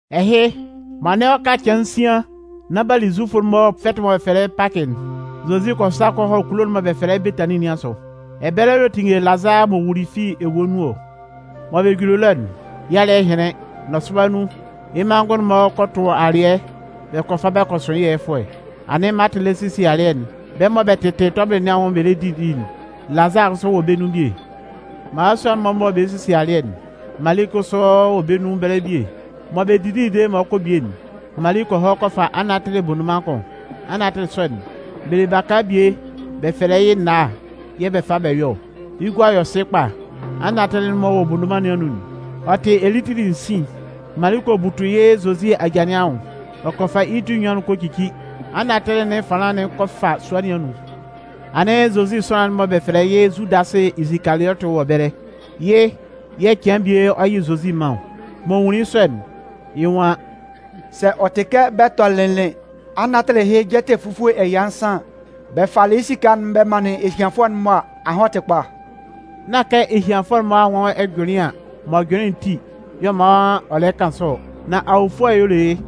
Ɛhɩ, m'ɔ anɩn ɔ ka cɩan nsian nán b'a li Zufʋ'n-mɔ fɛtɩ'n mɔ bɛ fɛlɛ yɩ́ Pakɩ'n, Zozi kɔ sa kɔ hɔ kulo'n mɔ bɛ fɛlɛ yɩ́ Betanin nɩn asʋ. Ɛbɛlɛ y'ɔ tinngelɩ Lazaa m'ɔ wuli'n fi ewue nun ɔ. M'ɔ juli ɛlɔ'n, yɩ́ alɩ́ɛ hɩnlɩn, nɔsʋba nun, yɩ́ manngʋn'n-mɔ kɔ tʋn alɩɛ bɛ kɔ fa bɛ kɔ sʋn yɩ́ ɛyɛfʋɛ. Anɩn Maatɩ lɛ sesie alɩɛ'n, bɛ́ mɔ bɛ lɩla tɔbɩlɩ nɩn anwʋn bɛ lɛ didi'n, Lazaa kʋsʋ wɔ bɛ́ nun bie. Mmalasua'n-mɔ mɔ bɛ sesie alɩɛ'n, Mali kʋsʋ wɔ bɛ́ nun ɛbɛlɛ bie. M'ɔ bɛ didili dede mɔ ɔ 'kɔ bie'n, Mali kɔ hɔ kɔ fa anatɩlɩ bondoman kʋn. Anatɩlɩ sɔ'n, bɛ le baka bie bɛ fɛlɛ yɩ́ náá yɛ̂ bɛ fa bɛ yɔ ɔ. Yɩ́ gua yɔ sɩ kpa. Anatɩlɩ'n m'ɔ wɔ bondoman nɩn anun'n, ɔ tɩ elitili sin. Mali kɔ butu yɩ́ Zozi aja nɩn anwʋn, ɔ kɔ fa yɩ́ ti enyuan'n kɔ cici. Anatɩlɩ nɩn ɛfanlan'n kɔ fa sua nɩn anun. Anɩn Zozi sʋanlan'n mɔ bɛ fɛlɛ yɩ́ Zudasɩ Isikaliɔtɩ wɔ ɛbɛlɛ. Yɩ́ yɛ̂ cian bie ɔ 'yɩ Zozi man ɔ. M'ɔ nwunlin yɩ́ sɔ'n, yɩ́ nwan: “Sɛ ɔ tɩ kɛ bɛ tɔnɩnlɩn anatɩlɩ ɛhɩ jɛtɛ fufue ɛya nsan yɛ̂ bɛ falɩ yɩ́ esika'n bɛ manlɩn ehianfʋɛ'n-mɔ a, ahan ɔ tɩ kpa.” Nán kɛ ehianfʋɛ'n-mɔ anwʋn ɛjʋnlɩan m'ɔ jʋnlɩn ti yɛ̂ ɔ man ɔ lɛ kan sɔ ɔ, nan awofʋɛ y'ɔ le yɩ́.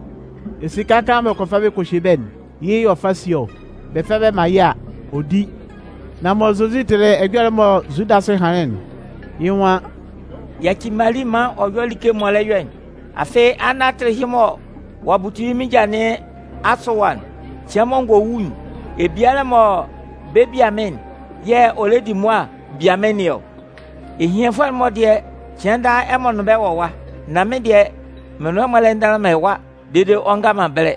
Esika kaan mɔ bɛ kɔ fa bɛ kɔ hye bɛ́'n, yɩ́ yɛ̂ ɔ fa sie ɔ. Bɛ fa bɛ man yɩ́ a, ɔ di. Nan mɔ Zozi tɩlɩ ɛjɔlɛ'n mɔ Zudasɩ hanlɩn'n, yɩ́ nwan: “Yaci Mali maan ɔ yɔ́ yɩ́ like'n m'ɔ lɛ yɔ'n. Afɩ, anatɩlɩ ɛhɩ mɔ ɔ'a butu yɩ́ mɩ́n ja nɩn asʋ ɛwa'n, cɩan mɔ n gɔ wu'n, ebialɛ'n mɔ bɛ 'bia mɩ́n'n yɛ̂ ɔ lɛ di mʋa bia mɩ́n nɩn ɔ. Ehianfʋɛ'n-mɔ dɩɛ, cɩan daa ɛmɔ nʋn bɛ́ wɔ ɛwa. Nan mɩ́n dɩɛ, mɩn nʋn ɛmɔ lɛ ndanlan man ɛwa dede ɔ nga man ɛbɛlɛ.”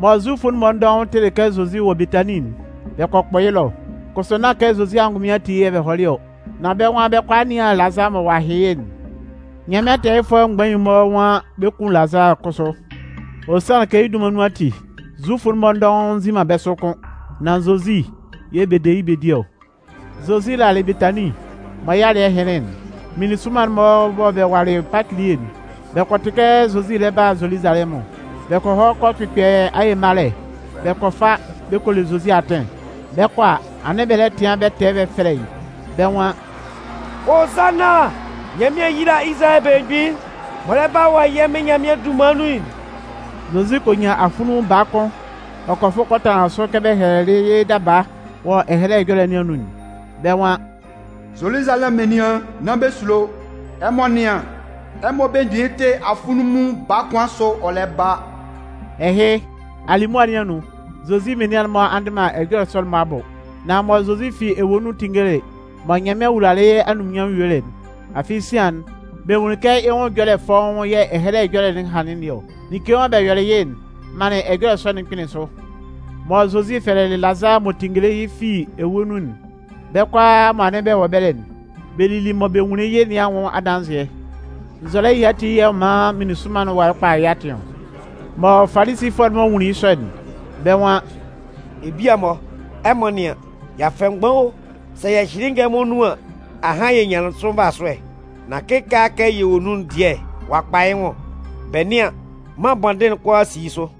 Mɔ Zufʋ'n-mɔ dɔʋn tɩlɩ kɛ Zozi wɔ Betanin'n, bɛ kɔ kpʋ yɩ́ ɛlɔ. Kʋsʋ nán kɛ Zozi angʋnmɩn ati yɛ̂ bɛ hɔlɩ ɔ, nan bɛ́ nwan bɛ 'kɔ a nɩan Lazaa mɔ ɔ'a hɩn yɩ́'n. Nyanmɩan tɛɛyɩfʋɛ mgbain'n-mɔ nwan bɛ 'kun Lazaa kʋsʋ. Ɔ sanlɩn kɛ yɩ́ dunman nun ati, Zufʋ'n-mɔ dɔʋn nzi man bɛ́ sʋ kʋ́n, nan Zozi yɛ̂ bɛ de yɩ́ bɛ di ɔ. Zozi lalɩ Betanin, mɔ yɩ́ alɩ́ɛ hɩnlɩn'n, meninsʋnman'n mɔ bɛ walɩ Pakɩ elie'n, bɛ kɔ tɩ kɛ Zozi lɛ ba Zoluzalɛmʋn. Bɛ kɔ hɔ kɔ kpɩkpɛ aye malɛ, bɛ kɔ fa bɛ kɔ le Zozi atɩn. Bɛ 'kɔ a, anɩn bɛ lɛ tɩan bɛ tɛ bɛ fɛlɛ yɩ́. Bɛ́ nwan: “Hozanna! Nyanmɩan yíla Izalayɛ Belemgbin'n m'ɔ lɛ ba wɔ Yɛ́ Mɩn Nyanmɩan dunman nun'n!” Zozi kɔ nyan afunlunmun baa kʋn ɔ kɔ fʋ kɔ tanlan sʋ kɛ bɛ hɛlɛlɩ yɩ́ daba wɔ Ɛhɛlɛ Ɛjɔlɛ nɩn anun'n. Bɛ́ nwan: Zoluzalɛmʋn menian, nán bɛ sulo. Ɛmɔ nɩ́an, ɛmɔ belemgbin'n tɩ afunlunmun baa kʋn sʋ, ɔ lɛ ba. Ɛhɩ, alimʋa nɩn anun, Zozi menian'n-mɔ a ndɩ man ɛjɔlɛ sɔ'n-mɔ abʋ. Nan mɔ Zozi fi ewue nun tinngelɩ mɔ Nyanmɩan wulalɩ yɩ́ anunminnyanmʋn yuelɩ'n, afɩ sian'n, bɛ nwunlin kɛ yɩ́ nwʋn ɛjɔlɛ fɔ́ʋ́n yɛ̂ Ɛhɛlɛ Ɛjɔlɛ'n hanlɩn nɩn ɔ, like mɔ bɛ yɔlɩ yɩ́'n manlɩn ɛjɔlɛ sɔ'n kpɩnlɩn sʋ. Mɔ Zozi fɛlɛlɩ Lazaa m'ɔ tinngelɩ yɩ́ fi ewue nun'n, bɛ́ kʋalaa mɔ anɩn bɛ wɔ ɛbɛlɛ'n, bɛ lili mɔ bɛ nwunlin yɩ́ nɩn anwʋn adanzɩɛ. Nzɔlɛ ɛhɩ ati y'ɔ man menisʋnman'n walɩ kpalɩ yɩ́ atɩn ɔ. Mɔ Falisifʋɛ'n-mɔ nwunlin yɩ́ sɔ'n, bɛ́ nwan: “Ebia-mɔ, ɛmɔ nɩ́an, y'a fɛ mgban o, sɛ yɛ hyɩlɩ yɩ́ ngɛlɛmɔ nun an, ahan yɛ nyanlɩn sʋ nvasʋɛ. Nan kɩkaala kɛ yɛ wɔ nun'n dɩɛ ɔ'a kpa yɩ́ nwʋn. Bɛ nɩ́an, mân bɔndɩn'n kʋalaa si yɩ́ sʋ!”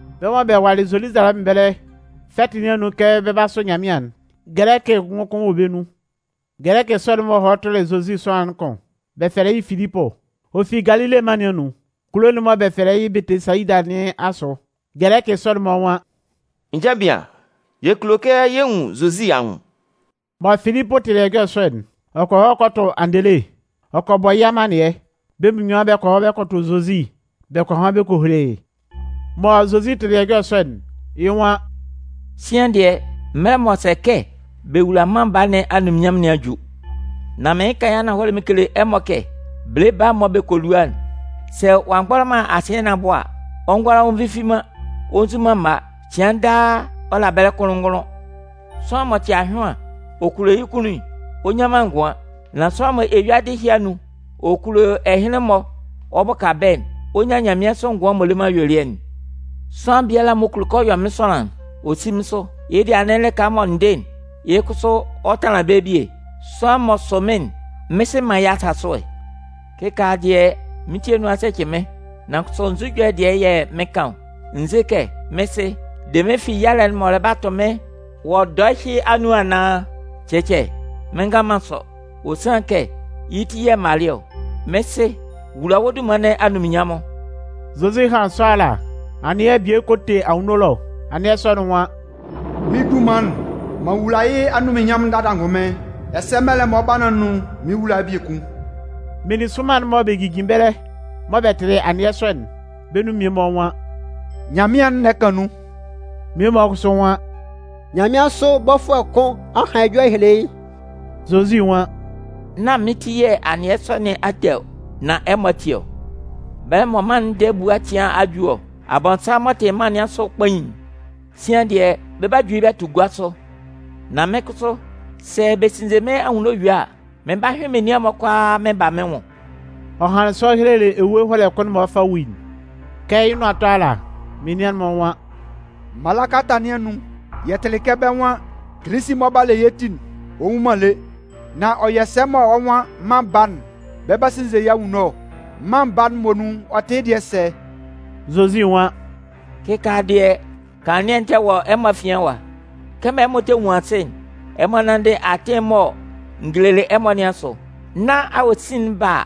Bɛ́ mɔ bɛ walɩ Zoluzalɛmʋn ɛbɛlɛ fɛtɩ nɩn anun kɛ bɛ 'ba a sʋ Nyanmɩan'n, Gɛlɛkɩ ngʋkʋn wɔ bɛ́ nun. Gɛlɛkɩ sɔ'n-mɔ hɔ tʋlɩ Zozi sʋanlan'n kʋn, bɛ fɛlɛ yɩ́ Filipʋ. Ɔ fi Galile mân nɩn anun, kulo'n mɔ bɛ fɛlɛ yɩ́ Bɛtɩsayida nɩn asʋ. Gɛlɛkɩ sɔ'n-mɔ nwan: “Nja bian, yɛ kulo kɛ yɛ nwun Zozi anwʋn.” Mɔ Filipʋ tɩlɩ ɛjɔlɛ sɔ'n, ɔ kɔ hɔ kɔ tʋ Andele, ɔ kɔ bɔ yɩ́ amannɩɛ. Bɛ́ munnyuan bɛ kɔ hɔ kɔ tʋ Zozi bɛ kɔ han bɛ kɔ hele yɩ́. Mɔ Zozi tɩlɩ ɛjɔlɛ sɔ'n, yɩ́ nwan: “Sian dɩɛ, mɛlɛ'n m'ɔ sɛ kɛ bɛ wula Mân Baa nɩn anunminnyanmʋn nɩn a ju. Nan mɩɩn kan yɩ́ ananhɔlɛ mɩn kele ɛmɔ kɛ bele baa'n mɔ bɛ kɔ lua'n, sɛ ɔ'a mgbɔlɔ man asɩɛ nɩn abʋ a, ɔ ngʋala ɔ nvifi man ɔ nzu man mma. Cɩan daa ɔ la ɛbɛlɛ kʋnlʋn-ngʋnlʋn. Sʋanlan m'ɔ tɩ ahyʋan ɔ kulo yɩ́ kunnun'n, ɔ nnyan man ngʋan. Nan sʋanlan m'ɔ eyuadɩ ɛtɛ ɛhɩ anun ɔ kulo ɛhɩnlɩn-mɔ ɔ bʋka bɛ́'n, ɔ 'nyan nyanmɩansʋ ngʋan m'ɔ le man ayuelɩɛ'n. Sʋanlan biala m'ɔ kulo kɛ ɔ yɔ mɩ́n sʋanlan'n, ɔ sí mɩ́n sʋ. Yɩ́ dɩɛ anɩn lɩka mɔ n dɩ'n, yɩ́ kʋsʋ, ɔ tanlan ɛbɛlɛ bie. Sʋanlan m'ɔ sʋ mɩ́n'n, mɩ́n Sɩ 'man yɩ́ asasʋɛ. “Kɩkaala dɩɛ, mɩ́n ti anun a sɛcɩ mɩ́n. Nan kʋsʋ nzu ɛjɔlɛ dɩɛ yɛ̂ mɩn 'kan ɔ? N ze kɛ, mɩ́n Sɩ, de mɩ́n fi yalɛ'n m'ɔ lɛ 'ba tʋ mɩ́n wɔ dɔɛ ɛhɩ anun anaan? Cɛcɛ, mɩ́n ngan man sɔ, ɔ sanlɩn kɛ yɩ́ ti yɛ̂ m malɩ ɔ. Mɩ́n Sɩ, wula wɔ́ dunman nɩn anunminnyanmʋn!” Zozi hanlɩn sɔ ala, anɩɛ bie kɔ te anwunno ɛlɔ. Anɩɛ sɔ'n nwan: “Mɩ́n dunman'n, m'an wula yɩ́ anunminnyanmʋn dada angʋnmɩn, ɛsɛ mɛlɛ'n m'ɔ lɛ ba nɩn anun, mɩn 'wula yɩ́ biekun.” Meninsʋnman'n mɔ bɛ jijin ɛbɛlɛ mɔ bɛ tɩlɩ anɩɛ sɔ'n, bɛ́ nun mmie-mɔ nwan: “Nyanmɩan'n lɛ kan nun.” Mmie-mɔ kʋsʋ nwan: “Nyanmɩansʋ bɔfʋɛ kʋn a han ɛjɔlɛ a hele yɩ́.” Zozi nwan: “Nán mɩ́n ti yɛ̂ anɩɛ sɔ nɩn a te ɔ, nan ɛmɔ ati ɔ. Bɛlɛ mɔ mân'n ndɛɛ ebua cɩan nɩn a ju ɔ. Abɔnsanmʋn m'ɔ tɩ mân nɩn asʋ kpain'n, sian dɩɛ, bɛ 'ba ju yɩ́ bɛ tʋ gua sʋ. Nan mɩ́n kʋsʋ, sɛ bɛ sinnze mɩ́n anwunno yue a, m 'ba hyʋɩn menian'n-mɔ kʋalaa mɩn ba mɩ́n nwʋn.” Ɔ hanlɩn sɔ ɔ helelɩ ewue ɛhɔlɛ kʋn'n mɔ ɔ 'fa wu'n. Kɛ yɩ́ nʋan 'tɔ ala, menian'n-mɔ nwan: “Mala kalata nɩn anun, yɛ tɩlɩ kɛ bɛ́ nwan Kilisi'n mɔ ɔ 'ba le yɛ́ ti'n, ɔ nwu man lé. Nan ɔ yɔ sɛ mɔ wɔ́ nwan Mân Baa'n, bɛ 'ba sinnze yɩ́ anwunno ɔ? Mân Baa'n muonun, ɔ tɩ yɩ́ dɩɛ sɛ?” Zozi nwan: “Kɩkaala dɩɛ, kanlannɩɛ'n tɛ wɔ ɛmɔ afian ɛwa. Kɛmɔ ɛmɔ tɛ nwun asɩ'n, ɛmɔ nánndɩ atɩn'n mɔ n gelelɩ ɛmɔ nɩn asʋ. Nán awosin'n ba a,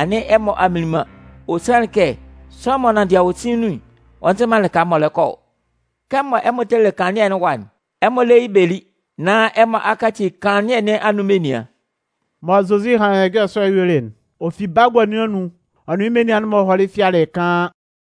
anɩn ɛmɔ a mminlin man. Ɔ sanlɩn kɛ sʋanlan m'ɔ nanndɩ awosin nun'n, ɔ nzɩ man lɩka m'ɔ lɛ kɔ ɔ. Kɛmɔ ɛmɔ tɛ le kanlannɩɛ nɩn ɛwa'n, ɛmɔ lé yɩ́ bɛ lí, nán ɛmɔ a kaci kanlannɩɛ nɩn anun menian.” Mɔ Zozi hanlɩn ɛjɔlɛ sɔ'n yuelɩ'n, ɔ fi bagua nun ɔ nʋn yɩ́ menian'n-mɔ hɔlɩ fɩalɩ kaan.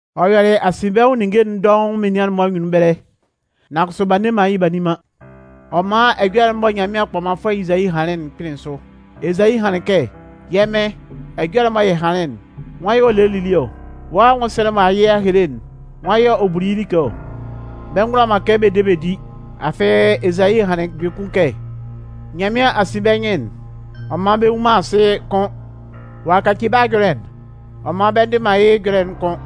Ɔ yɔlɩ asinbɛnwʋn ninnge'n dɔʋn menian'n-mɔ anyunnun ɛbɛlɛ, nan kʋsʋ b'a nne man yɩ́ b'a nni man. Ɔ man ɛjɔlɛ'n mɔ Nyanmɩan Kpɔmanfʋɛ Ezayi hanlɩn'n, kpɩnlɩn sʋ. Ezayi hanlɩn kɛ: Yɛ́ Mɩn, ɛjɔlɛ'n mɔ yɛ hanlɩn'n, nwan yɛ̂ ɔ lelɩ lili ɔ? Wɔ́ anwʋnsɛlɛ'n mɔ a yɩ a hele'n, nwan yɛ̂ ɔ buli yɩ́ like ɔ? Bɛ ngʋala man kɛ bɛ de bɛ di, afɩ Ezayi hanlɩn biekun kɛ: Nyanmɩan a sin bɛ́ nyɩn'n, ɔ man bɛ nnwun man asɩ kʋ́n. Ɔ'a kaci bɛ́ ajʋnlɩn'n, ɔ man bɛ ndɩ man yɩ́ ɛjɔlɛ'n kʋ́n.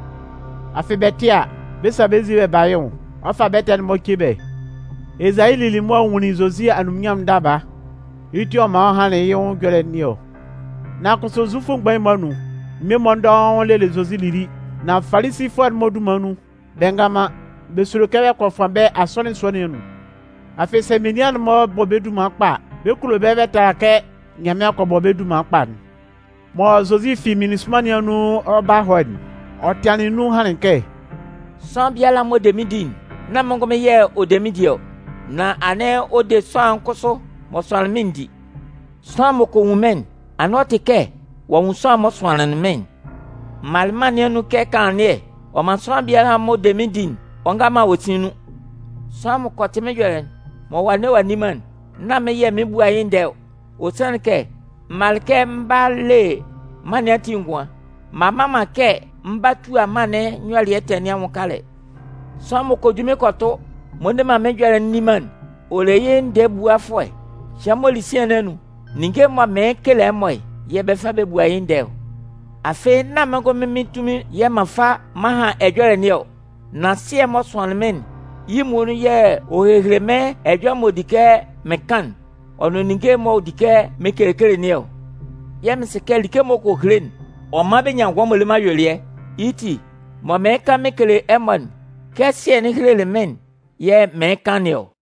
Afɩ, bɛ tɩ a, bɛ 'sa bɛ́ nzin bɛ ba yɩ́ nwʋn ɔ fa bɛ́ ɛtɛ'n-mɔ ce bɛ́. Ezayi lili mʋa nwunlin Zozi anunminnyanmʋn'n daba, yɩ́ ti yɛ̂ ɔ man ɔ hanlɩn yɩ́ nwʋn ɛjɔlɛ nɩn ɔ. Nan kʋsʋ Zufʋ mgbain'n-mɔ anun, mmie-mɔ dɔʋn lelɩ Zozi lili. Nan Falisifʋɛ'n-mɔ dunman nun, bɛ ngan man, bɛ sulo kɛ bɛ kɔ fʋan bɛ́ asɔnɩn sua nɩn anun. Afɩ sɛ menian'n-mɔ bɔ bɛ́ dunman kpa a, bɛ kulo bɛ tala kɛ Nyanmɩan kɔ bɔ bɛ́ dunman kpa'n. Mɔ Zozi fi meninsʋnman nɩn anun ɔ 'ba hɔ'n, ɔ tɩanlɩn nun hanlɩn kɛ: “Sʋanlan biala m'ɔ de mɩ́n di'n, nán mɩ́n ngʋnmɩn yɛ̂ ɔ de mɩ́n di ɔ, nan anɩn ɔ de sʋanlan'n kʋsʋ m'ɔ sʋanlɩn mɩ́n'n di. Sʋanlan m'ɔ kɔ nwun mɩ́n'n, anɩn ɔ tɩ kɛ ɔ'a nwun m'ɔ sʋanlɩn mɩ́n'n. M malɩ mân nɩn anun kɛ kanlannɩɛ, ɔ man sʋanlan biala m'ɔ de mɩ́n di'n, ɔ nga man awosin nun. “Sʋanlan m'ɔ kɔ tɩ mɩ́n ɛjɔlɛ'n, mɔ ɔ'a nne ɔ'a nni man'n, nán mɩ́n yɛ̂ mɩn 'bua yɩ́ ndɛɛ ɔ. Ɔ sanlɩn kɛ m malɩ kɛ m 'ba le mân nɩn ati ngʋan, m'an mma man kɛ m 'ba tua mân'n nyɔlɩɛ ɛtɛ nɩn anwʋn kalɛ. Sʋanlan m'ɔ kɔ ju mɩ́n kɔ tʋ, m'ɔ nne man mɩ́n ɛjɔlɛ'n nni man'n, ɔ le yɩ́ ndɛɛ ebuafʋɛ. Cɩan m'ɔ li sian nɩn anun, ninnge'n mɔ mɩɩn kekele ɛmɔ'n, yɛ̂ bɛ 'fa bɛ bua yɩ́ ndɛɛ ɔ. Afɩ nán mɩ́n ngʋnmɩn mɩ́n tunmin yɛ̂ m'an fa m'an han ɛjɔlɛ nɩn ɔ. Nan Sɩɛ'n m'ɔ sʋanlɩn mɩ́n'n, yɩ́ muonun yɛ̂ ɔ helelɩ mɩ́n ɛjɔlɛ'n m'ɔ di mɔ mɩn kan'n, ɔ nʋn ninnge'n m'ɔ di mɔ mɩn kekele nɩn ɔ. Yɛ̂ mɩn sɩ kɛ like m'ɔ kɔ hele'n, ɔ man bɛ nyan ngʋan m'ɔ le man ayuelɩɛ. Yɩ́ ti, mɔ mɩɩn kan mɩn kele ɛmɔ'n, kɛ Sɩɛ'n helelɩ mɩ́n'n yɛ̂ mɩɩn kan nɩn ɔ.”